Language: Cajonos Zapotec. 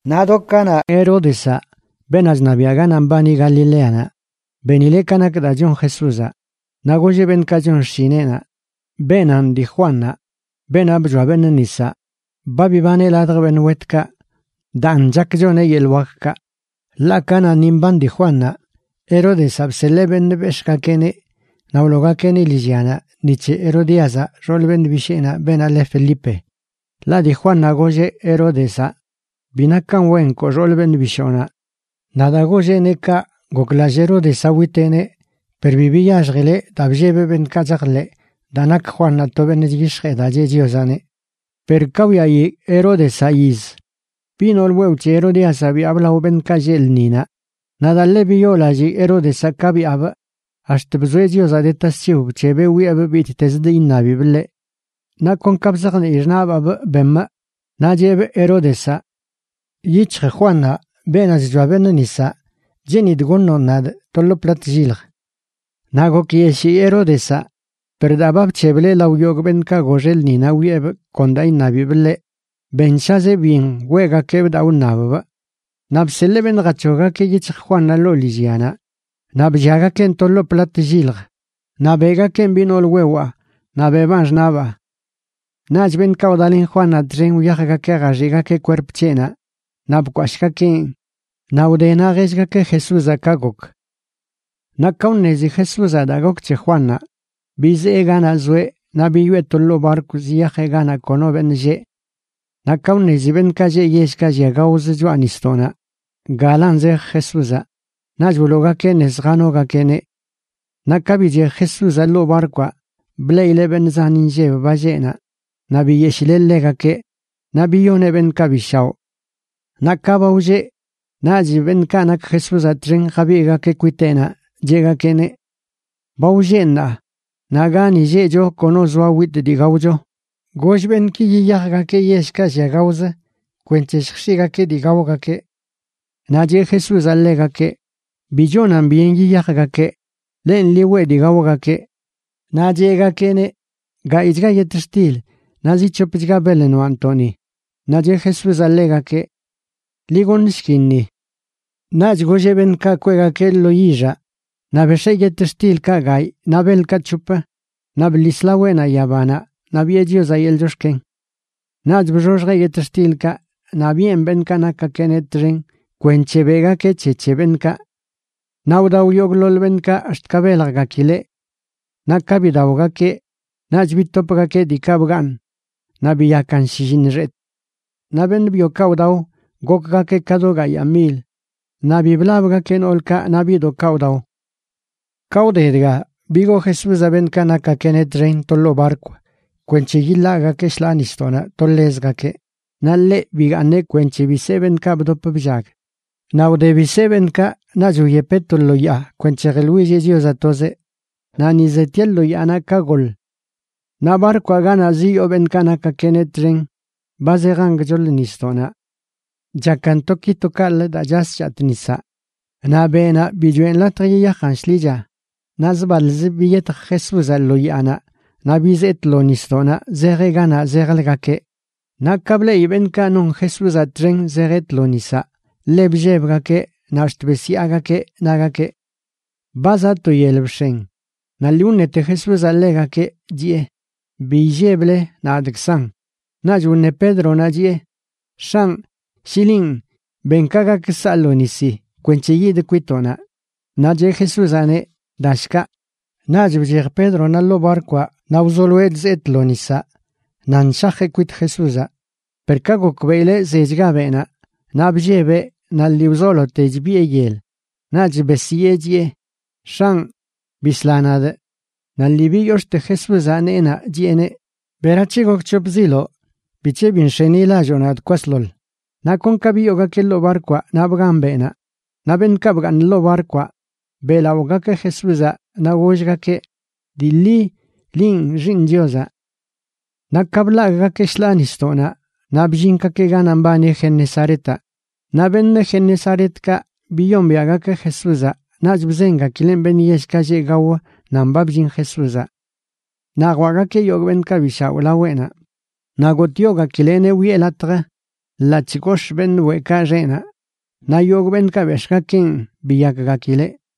Naꞌ do kanaꞌ, Heródezaꞌ, beenaꞌ chṉabiaꞌ ganaꞌ mbani Galileanaꞌ, benileꞌ ka nak daa chon Jesúzaꞌ. Naꞌ golleꞌ beṉꞌkaꞌ chon xshineꞌnaꞌ: ―Beenanꞌ dii Juannaꞌ, beenaꞌ bchoa beṉꞌ nisaꞌ. Ba bibaneꞌ ladj beṉꞌ wetkaꞌ, daan chak choneꞌ yeḻꞌ wakkaꞌ. Ḻaꞌ kanaꞌ ni mban dii Juannaꞌ, Heródezaꞌ bseḻee beṉꞌ bex̱ꞌgakeꞌneꞌ naꞌ wloogakeꞌneꞌ lillyanaꞌ ni c̱he Herodíazaꞌ xool beṉꞌ bisheenaꞌ, beenaꞌ le Felipe. Ḻaꞌ dii Juannaꞌ golleꞌ Heródezaꞌ: ―Bi nakan wen nkoo xool beṉꞌ bishoonaꞌ. Naꞌ daa golleꞌneꞌ kaꞌ goklallꞌ Heródezaꞌ witeꞌneꞌ, per bi biyaxjileꞌ daa bllebeꞌ beṉꞌkaꞌ chajḻeꞌ daa nak Juannaꞌ to beṉꞌ chyix̱jee daa cheꞌ Chiozaꞌneꞌ. Per ka wyaꞌi Heródezaꞌ yiz, biꞌ nool wewꞌ c̱he Herodíazaꞌ byaabꞌ lao beṉꞌkaꞌ lleꞌ lṉinaꞌ. Naꞌ daa ḻe biyoolallii Heródezaꞌ ka byaabꞌ ax̱t bzoeꞌ Chiozaꞌ de tasc̱hiw bc̱hebeꞌ wiꞌebꞌ bittezə dii iṉabibꞌ ḻeꞌ. Naꞌ kon ka bzajnii xṉaꞌbaabꞌ bemꞌ, naꞌ cheꞌbꞌ Heródezaꞌ: ―Yic̱hj Juannaꞌ, beenaꞌ chchoa beṉꞌ nisaꞌ, cheenidꞌ goṉoꞌn nadꞌ to lo plat llilj. Naꞌ gokyeshii Heródezaꞌ, per daa ba bc̱hebleꞌ lao yogꞌ beṉꞌkaꞌ goxeꞌ lṉinaꞌ wiꞌebꞌ kon daa iṉabibꞌ ḻeꞌ, benshazeꞌ byen weꞌgakeꞌbꞌ daa wṉabbꞌ. Naꞌ bseḻee beṉꞌ jac̱hoggakeꞌ yic̱hj Juannaꞌ ḻoo lillyanaꞌ. Naꞌ blliagakeꞌn to lo plat llilj naꞌ beꞌgakeꞌn biꞌ nool wewaa naꞌ beꞌbaan xṉaꞌbaa. Naꞌch beṉꞌkaꞌ wdalen Juannaꞌ txen wyajgakeꞌ jaxiꞌgakeꞌ kwerp c̱heꞌnaꞌ naꞌ bkwashꞌgakeꞌn. Naꞌ wdenaꞌ jellgakeꞌ Jesúzaꞌ ka gok. Naꞌ ka wṉezi Jesúzaꞌ daa gok c̱he Juannaꞌ, bizee ganaꞌ zoeꞌ naꞌ biyoꞌe to ḻoo barkw ziyajeꞌ ganaꞌ kono beṉꞌ lleꞌ. Naꞌ ka wṉezi beṉꞌkaꞌ lleꞌ yellkaꞌ llia gaozə choꞌa nisdoꞌnaꞌ galan zej Jesúzaꞌ, naꞌch wloogakeꞌ nez janogakeꞌneꞌ. Naꞌ ka bichej Jesúzaꞌ ḻoo barkwaꞌ, bleꞌileꞌ beṉꞌ zan inlleb ba lleꞌ naꞌ, naꞌ biyeshileꞌ ḻegakeꞌ naꞌ biyoneꞌ beṉꞌkaꞌ bi shaoꞌ. Naꞌ ka ba wlleꞌ, naꞌch beṉꞌkaꞌ nak Jesúzaꞌ txen jabigꞌgakeꞌ kwiteꞌnaꞌ, cheꞌgakeꞌneꞌ: ―Ba wlleꞌ ṉaa, naꞌ gani lleꞌcho kono zoa witꞌ dii gaocho. Goll beṉꞌki yiyajgakeꞌ yellkaꞌ llia gaozə kwenc̱he lljx̱iꞌgakeꞌ dii gaogakeꞌ. Naꞌ cheꞌ Jesúzaꞌ ḻegakeꞌ: ―Bi chonan byen yiyajgakeꞌ. Lenꞌ, ḻi weꞌ dii gaogakeꞌ. Naꞌ cheꞌgakeꞌneꞌ: ―Gayꞌchga yetxtil naꞌ zi c̱hopchga beḻ noaꞌntoꞌ ni. Naꞌ cheꞌ Jesúzaꞌ ḻegakeꞌ: ―Ḻi goṉshkin ni. Naꞌch golleꞌ beṉꞌkaꞌ kweꞌgakeꞌ lo yixaꞌ. Naꞌ bex̱ee yetxtilkaꞌ gayꞌ naꞌ beḻkaꞌ c̱hop naꞌ bḻis laweꞌnaꞌ yabanaꞌ naꞌ biꞌe Chiozaꞌ yeḻꞌ chox̱ken. Naꞌch bxoxjeꞌ yetxtilkaꞌ naꞌ biꞌen beṉꞌkaꞌ nakgakeꞌneꞌ txen kwenc̱he beꞌgakeꞌ c̱he c̱he beṉꞌkaꞌ. Naꞌ wdao yogꞌḻoḻ beṉꞌkaꞌ ax̱t ka beljgakileꞌ. Naꞌ ka bidaogakeꞌ, naꞌch bitopgakeꞌ diikaꞌ bgaaṉ, naꞌ biyakan shlliṉ xetꞌ. Naꞌ beṉꞌ byokaꞌ wdao gokgakeꞌ ka do gayaa mil, naꞌ bi blabgakeꞌ noolkaꞌ naꞌ biꞌdoꞌkaꞌ wdao. Ka wde dga bigoo Jesúzaꞌ beṉꞌkaꞌ nakgakeꞌneꞌ txen to ḻoo barkw kwenc̱he yiḻagꞌgakeꞌ shḻaa nisdoꞌnaꞌ to ḻezgakeꞌ, naꞌ ḻeꞌ bigaaṉeꞌ kwenc̱he bisee beṉꞌkaꞌ bdop bllag. Naꞌ wde bisee beṉꞌkaꞌ, naꞌch wyepeꞌ to lo yaa kwenc̱he jeḻwilleꞌ Chiozaꞌ tozeꞌ. Naꞌ ni zetieꞌ lo yaanaꞌ ka goḻ. Naꞌ barkwaꞌ ganaꞌ ziyoo beṉꞌkaꞌ nakgakeꞌneꞌ txen ba zejan gchoḻ nisdoꞌnaꞌ. Chakan to ki to kaꞌlə daa chas chatꞌ nisaꞌ, naꞌ beꞌnaꞌ bi choꞌen latj yiyajan shḻicha. Naꞌ zbaḻz biyetj Jesúzaꞌ lo yaanaꞌ naꞌ bizee tlo nisdoꞌnaꞌ zejeꞌ ganaꞌ zejləgakeꞌ. Naꞌ ka bleꞌi beṉꞌkaꞌ non Jesúzaꞌ txen zejeꞌ tlo nisaꞌ, ḻe bllebgakeꞌ naꞌ ax̱t besyaagakeꞌ, nagakeꞌ: ―¡Ba zaꞌ to yel bx̱en! Naꞌ lii wṉete Jesúzaꞌ ḻegakeꞌ, chiꞌe: ―Bi illeble. Nadꞌkzanꞌ. Naꞌch wṉe Pédronaꞌ chiꞌe: ―X̱anꞌ, shi linꞌ, ben ka gak saa lo nisi kwenc̱he yidꞌ kwitoꞌnaꞌ. Naꞌ cheꞌ Jesúzaꞌneꞌ: ―Dashkaꞌ. Naꞌch bchej Pédronaꞌ ḻoo barkwaꞌ naꞌ wzoloeꞌ chzee tlo nisaꞌ nan shajeꞌ kwit Jesúzaꞌ. Per ka gokbeꞌileꞌ zechga beꞌnaꞌ, naꞌ bllebeꞌ naꞌ lii wzolote chbiꞌe yel, naꞌch besyee chiꞌe: ―¡X̱anꞌ, bisla nadꞌ! Naꞌ lii biyox̱ꞌte Jesúzaꞌ neenaꞌ, chiꞌeneꞌ: ―¿Berac̱he gokc̱hopziloꞌ? ¿Bic̱he bi nx̱enilalloo nadꞌ kwasḻoḻ? Naꞌ kon ka biyoogakeꞌ ḻoo barkwaꞌ naꞌ bgan beꞌnaꞌ. Naꞌ beṉꞌkaꞌ bgaaṉ ḻoo barkwaꞌ, beꞌlaꞌogakeꞌ Jesúzaꞌ naꞌ gollgakeꞌ: ―Dii ḻi, linꞌ Xiiṉ Chiozaꞌ. Naꞌ ka bḻagꞌgakeꞌ shḻaa nisdoꞌnaꞌ naꞌ bllingakeꞌ ganaꞌ mbani Genesaretaꞌ. Naꞌ beṉꞌ Genesaretkaꞌ biyombiaꞌgakeꞌ Jesúzaꞌ naꞌch bzengakileꞌ beṉꞌ yellkaꞌ lleꞌ gao nan ba bllin Jesúzaꞌ. Naꞌ jwaꞌgakeꞌ yogꞌ beṉꞌkaꞌ bi shaoꞌ laweꞌnaꞌ, naꞌ gotꞌyogakileꞌneꞌ wiꞌe latj ḻaꞌc̱hꞌ gox̱ꞌ beṉꞌ weꞌkaꞌ xeꞌnaꞌ, naꞌ yogꞌ beṉꞌkaꞌ bex̱ꞌgakeꞌn biyakgakileꞌ.